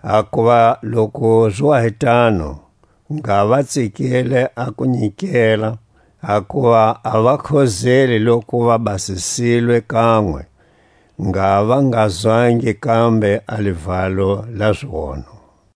Hakuva loku zi wa hi tano, ngha va tsikile a ku nyikela, hakuva a vakhozeli loku va basisilwe kanwe, ngha va nga zwangi kambe a livalo la zionho.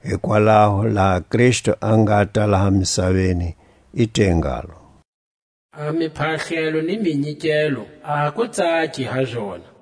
Hikwalaho laha Kristu a ngata laha misaveni, i te ngalo: A miphahlelo ni minyikelo a ku tsaki ha zona,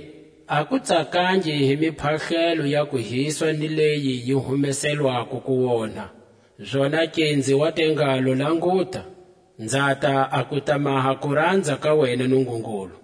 A ku tsakangi hi miphahlelo ya kuhiswa ni leyi yi humeselwako kuonha. Zonake nzi wa te ngalo: Languta, nzata a ku ta maha kuranza ka wena Nungungulu.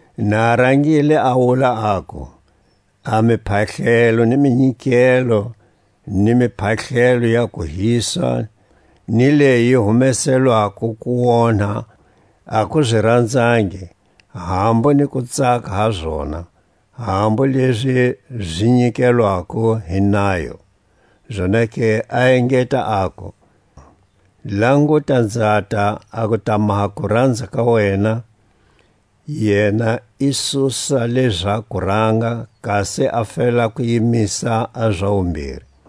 Na a rangile a wula aku: A miphahlelo ni minyikelo, ni miphahlelo ya kuhiswa ni leyi yi humeselwako kuonha a ku zi ranzangi, hambu ni ku tsaka ha zona (hambu lezi zi nyikelwako hi nayo). Zonake a engeta, aku: Languta, nzata a ku ta maha kuranza ka wena. Yena i susa leʼza kuranga, kasi a fela ku yimisa a za wumbiri.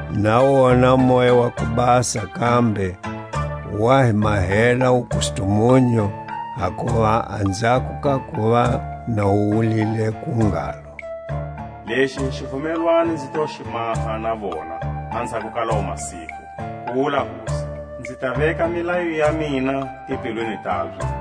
Na wona Moya wa ku Basa kambe wa hi mahela wukustumunyu; hakuva anzhako ka kuva na wu wulile ku ngalo: Lexi hi xivumelwano nzi to xi maha na vona anzhako ka lawo masiku, ku wula Hosi; Nzi ta veka milayo ya mina timbilwini tabye,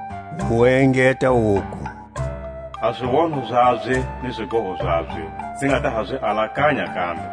Wu engeta wuku: A zionho zabye ni zigoho zabye nzi nga ta zi alakanya kambe.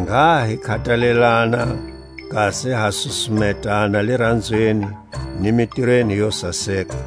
Ngha hi khatalelana kasi ha susumetana liranzweni ni mitirweni yo saseka;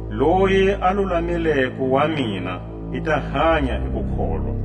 Loyi a lulamileko wa mina i ta hanya hi kukholwa;